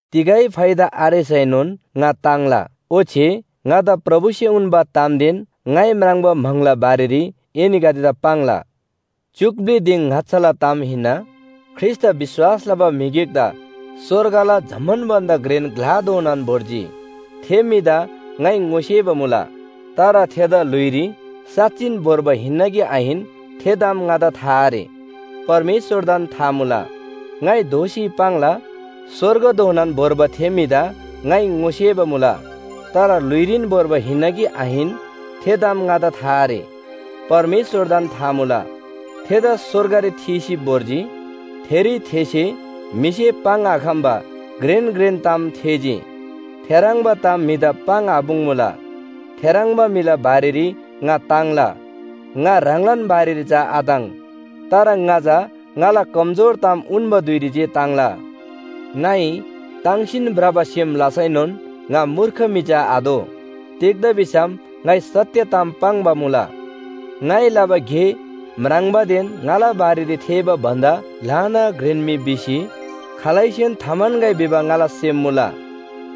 तिगै फाइदा आरेसैनोन ङा ताङ्ला। ओच्‍छे ङादा प्रभुसे उन्‍बा तामदेन ङाइ म्राङ्बा म्‍हाङला बारेरी एनीगदेदा पाङ्ला। च्‍युक ब्‍लि दिङ ङाच्‍छाला ताम हिन्‍ना, ख्रीष्‍टदा विश्‍वास लबा म्‍हि गिकदा स्‍वर्गला जम्‍मान भन्‍दा घ्रेन ग्‍लाधोनान भोर्जी। थे म्‍हिदा ङाइ ङोसेबा मुला, तर थेदा ल्‍हुइरी साँच्‍चिन भोर्बा हिन्‍ना कि आहिन थे ताम ङादा था आरे, परमेश्‍वरदान था मुला। ङाइ दोःसी पाङ्ला, स्‍वर्गधोनान भोर्बा थे म्‍हिदा ङाइ ङोसेबा मुला। तर ल्‍हुइरीन भोर्बा हिन्‍ना कि आहिन, थे ताम ङादा था आरे, परमेश्‍वरदान था मुला। थेदा स्‍वर्गरी थीसी भोर्जी, थेरी थेसे म्‍हिसे पाङ्‌आखम्‍बा घ्रेन घ्रेन ताम थेःजी, थेह्रङ्बा ताम म्‍हिदा पाङ्‌आपुङ्‌मुला। थेह्रङ्बा म्‍हिला बारेरी ङा ताङ्ला, ङा ह्राङलान बारेरी चा आताङ्। तर ङा चा ङाला कमजोर ताम उन्‍बा धुइरी जे ताङ्ला। ङाइ ताङ्‌सीन भ्रबा सेम लसैनोन ङा मूर्ख म्‍हि चा आदो। तिग्‍दा भिसम ङाइ सत्‍य ताम पाङ्बा मुला। ङाइ लबा गे म्राङ्बादेन ङाला बारेरी थेःबा भन्‍दा ल्‍हाना घ्रेन म्‍हि भिसी खालैसेन थाम्‍हन्‍गै भिबा ङाला सेम मुला।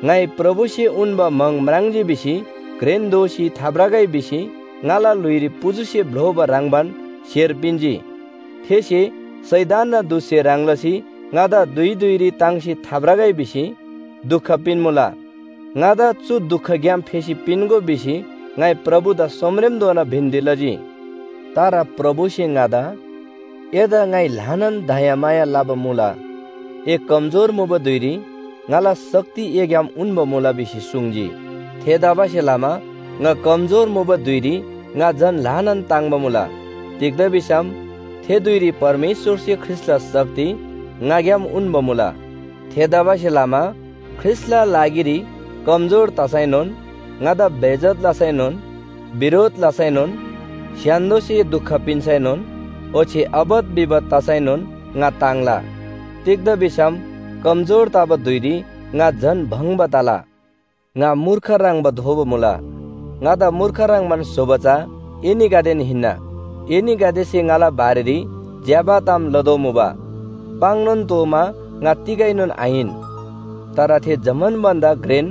ङाइ प्रभुसे उन्‍बा म्‍हाङ म्राङ्जी भिसी घ्रेन दोसी थाभ्रगै भिसी ङाला ल्‍हुइरी पुजुसे भ्‍लोबा ह्रङ्‌बान स्‍हेर पिन्‍जी। थेसे शैतानना दूतसे ह्रङ् लसी ङादा धुइ धुइरी ताङ्सी थाभ्रगै भिसी दुख पिन्‍मुला। “ङादा चु दुखग्‍याम फेसी पिन्‍गो” भिसी ङाइ प्रभुदा सोमरेमधोना बिन्‍ती लजी। तर प्रभुसे ङादा “ङाइ एदा ल्‍हानान दयामाया लबा मुला, ए कमजोर मुबा धुइरी ङाला शक्ति एग्‍याम उन्‍बा मुला” भिसी सुङ्जी। थेतबासेलमा ङा कमजोर मुबा धुइरी ङा झन ल्‍हानान ताङ्‍बा मुला। तिग्‍दा भिसम थे धुइरी परमेश्‍वरसे ख्रीष्‍टला शक्ति ङाग्‍याम उन्‍बा मुला। थेतबासेलमा ख्रीष्‍टला लागिरी कमजोर तसैनोन, ङादा बेइज्‍जत लसैनोन, बिरोध लसैनोन, स्‍य्‍हान्‍दोसे दुख पिन्‍सैनोन, ओच्‍छे आपत विपत तसैनोन ङा ताङ्ला। तिग्‍दा भिसम कमजोर तबा धुइरी ङा झन भङ्‍बा तला। ङा मूर्ख ह्रङ्‌बा दोबा मुला, ङादा मूर्ख ह्रङ्‌बान स्‍होबा चा एनीगदेन हिन्‍ना। एनीगदेसे ङाला बारेरी ज्‍यबा ताम लतोःमुबा। पाङ्‌नोन तोःमा ङा तिगैनोन आहिन, तर थे जम्‍मान भन्‍दा घ्रेन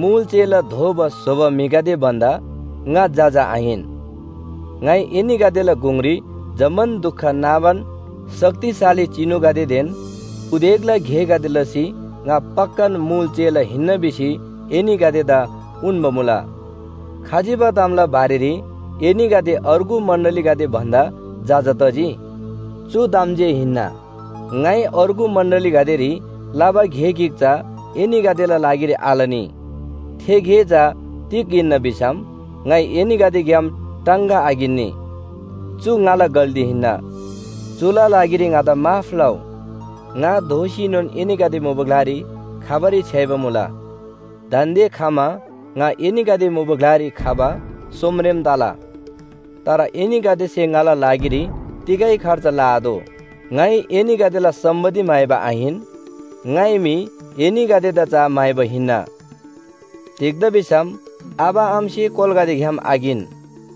मुल चेला दोबा स्‍होबा म्‍हिगदे भन्‍दा ङा जजा आहिन। ङाइ एनीगदेला गुङरी जम्‍मान दुख नाबान शक्तिशाली चिनुगदेदेन उदेकला गेगदे लसी ङा पक्‍कान मुल चेला हिन्‍ना भिसी एनीगदेदा उन्‍बा मुला। खजिबा तामला बारेरी एनीगदे अर्गु मण्‍डलीगदे भन्‍दा जजा तजी? चु ताम जे हिन्‍ना, ङाइ अर्गु मण्‍डलीगदेरी लबा गे गिक चा एनीगदेला लागिरी आलनी। थे गे चा तिग हिन्‍ना भिसम ङाइ एनीगदेग्‍याम टाङगा आकिन्‍नी। चु ङाला गल्‍ती हिन्‍ना, चुला लागिरी ङादा माफ लउ। ङा दोःसीनोन एनीगदे मुबा ग्‍लारी खबारी छ्‌याइबा मुला। दान्‍दे खमा ङा एनीगदे मुबा ग्‍लारी खबा सोमरेम तला। तर एनीगदेसे ङाला लागिरी तिगै खर्च लआतोः। ङाइ एनीगदेला सम्‍पत्ति म्‍हाइबा आहिन, ङाइ मी एनीगदेदा चा म्‍हाइबा हिन्‍ना। तिग्‍दा भिसम आबा आमासे कोलागदेग्‍याम आकिन,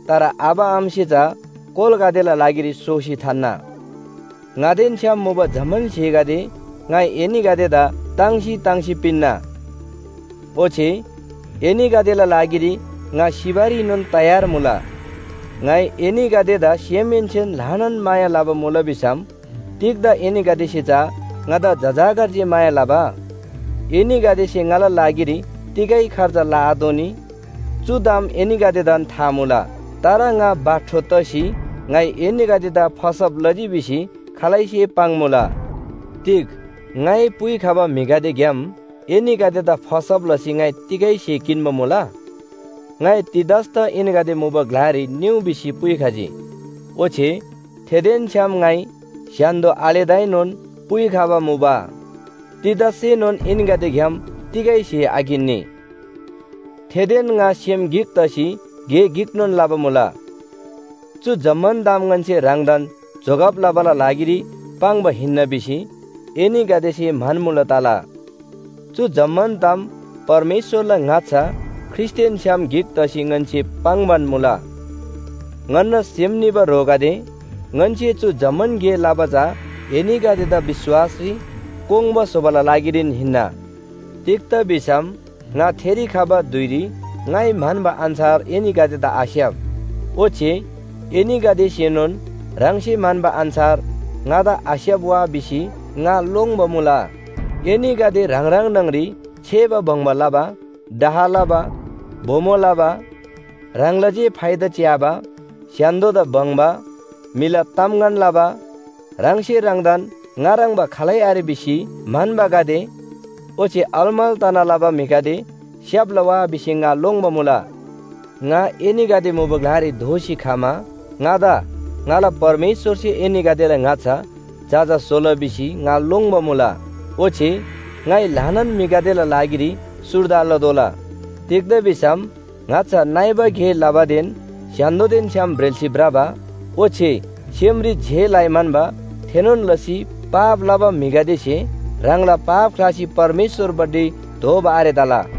तर आबा आमासे चा कोलागदेला लागिरी सोसी थान्‍ना। ङादेन छ्‌याम मुबा जम्‍मान स्‍हेगदे ङाइ एनीगदेदा ताङ्सी ताङ्सी पिन्‍ना। ओच्‍छे एनीगदेला लागिरी ङा सिबारीनोन तयार मुला। ङाइ एनीगदेदा सेमहेन्‍सेन ल्‍हानान माया लबा मुला भिसम तिग्‍दा एनीगदेसे चा ङादा जजाकर जे माया लबा? एनीगदेसे ङाला लागिरी तिगै खर्च लआतोःनी, चु ताम एनीगदेदान था मुला। तर ङा बाठो तसी ङाइ एनीगदेदा फसब लजी भिसी खालैसे पाङ्‌मुला। तिग ङाइ पुइखबा म्‍हिगदेग्‍याम एनीगदेदा फसब लसी ङाइ तिगै स्‍हे किन्‍बा मुला? ङाइ तीतसदा एनीगदे मुबा ग्‍लारी निउ भिसी पुइखजी, ओच्‍छे थेदेन छ्‌याम ङाइ स्‍य्‍हान्‍दो आलेदाएनोन पुइखबा मुबा। तीतससेनोन एनीगदेग्‍याम तिगै स्‍हे आकिन्‍नी। थेदेन ङा सेम गिक तसी गे गिकनोन लबा मुला। चु जम्‍मान ताम ङन्‍से ह्राङदान जोगब लबाला लागिरी पाङ्बा हिन्‍ना भिसी एनीगदेसे म्‍हन्‍मुला तला। चु जम्‍मान ताम परमेश्‍वरला ङाच्‍छा ख्रीष्‍टदेन छ्‌याम गिक तसी ङन्‍से पाङ्‌बान मुला। ङन्‍ना सेम निबा ह्रोगदे, ङन्‍से चु जम्‍मान गे लबा चा एनीगदेदा विश्‍वासरी कोङ्बा स्‍होबाला लागिरीन हिन्‍ना। तिग्‍दा भिसम ङा थेरी खबा धुइरी ङाइ म्‍हन्‍बा अन्‍छार एनीगदेदा आस्‍याप, ओच्‍छे एनीगदेसेनोन ह्राङसे म्‍हन्‍बा अन्‍छार ङादा आस्‍याप वा भिसी ङा लोङ्‌बा मुला। एनीगदे ह्राङ ह्राङ न्‍हङरी छेबा बङ्बा लबा, डाह लबा, बोमो लबा, ह्राङला जे फाइदा च्‍याबा, स्‍य्‍हान्‍दोदा बङ्बा, म्‍हिला तामगन लबा, ह्राङसे ह्राङदान ङा ह्रङ्‌बा खालै आरे भिसी म्‍हन्‍बागदे ओच्‍छे अलमल तना लबा म्‍हिगदे स्‍याप्‍ला वा भिसी ङा लोङ्‌बा मुला। ङा एनीगदे मुबा ग्‍लारी दोःसी खमा ङादा ङाला परमेश्‍वरसे एनीगदेला ङाच्‍छा जजा स्‍होला भिसी ङा लोङ्‌बा मुला। ओच्‍छे ङाइ ल्‍हानान म्‍हिगदेला लागिरी सुर्दा लतोःला। तिग्‍दा भिसम ङाच्‍छा नइबा गे लबादेन स्‍य्‍हान्‍दोदेन छ्‌याम ब्रेल्‍सी भ्रबा ओच्‍छे सेमरी जे लइ म्‍हन्‍बा थेनोन लसी पाप लबा म्‍हिगदेसे ह्राङला पाप ख्‍लासी परमेश्‍वरपट्टि दोःबा आरे तला।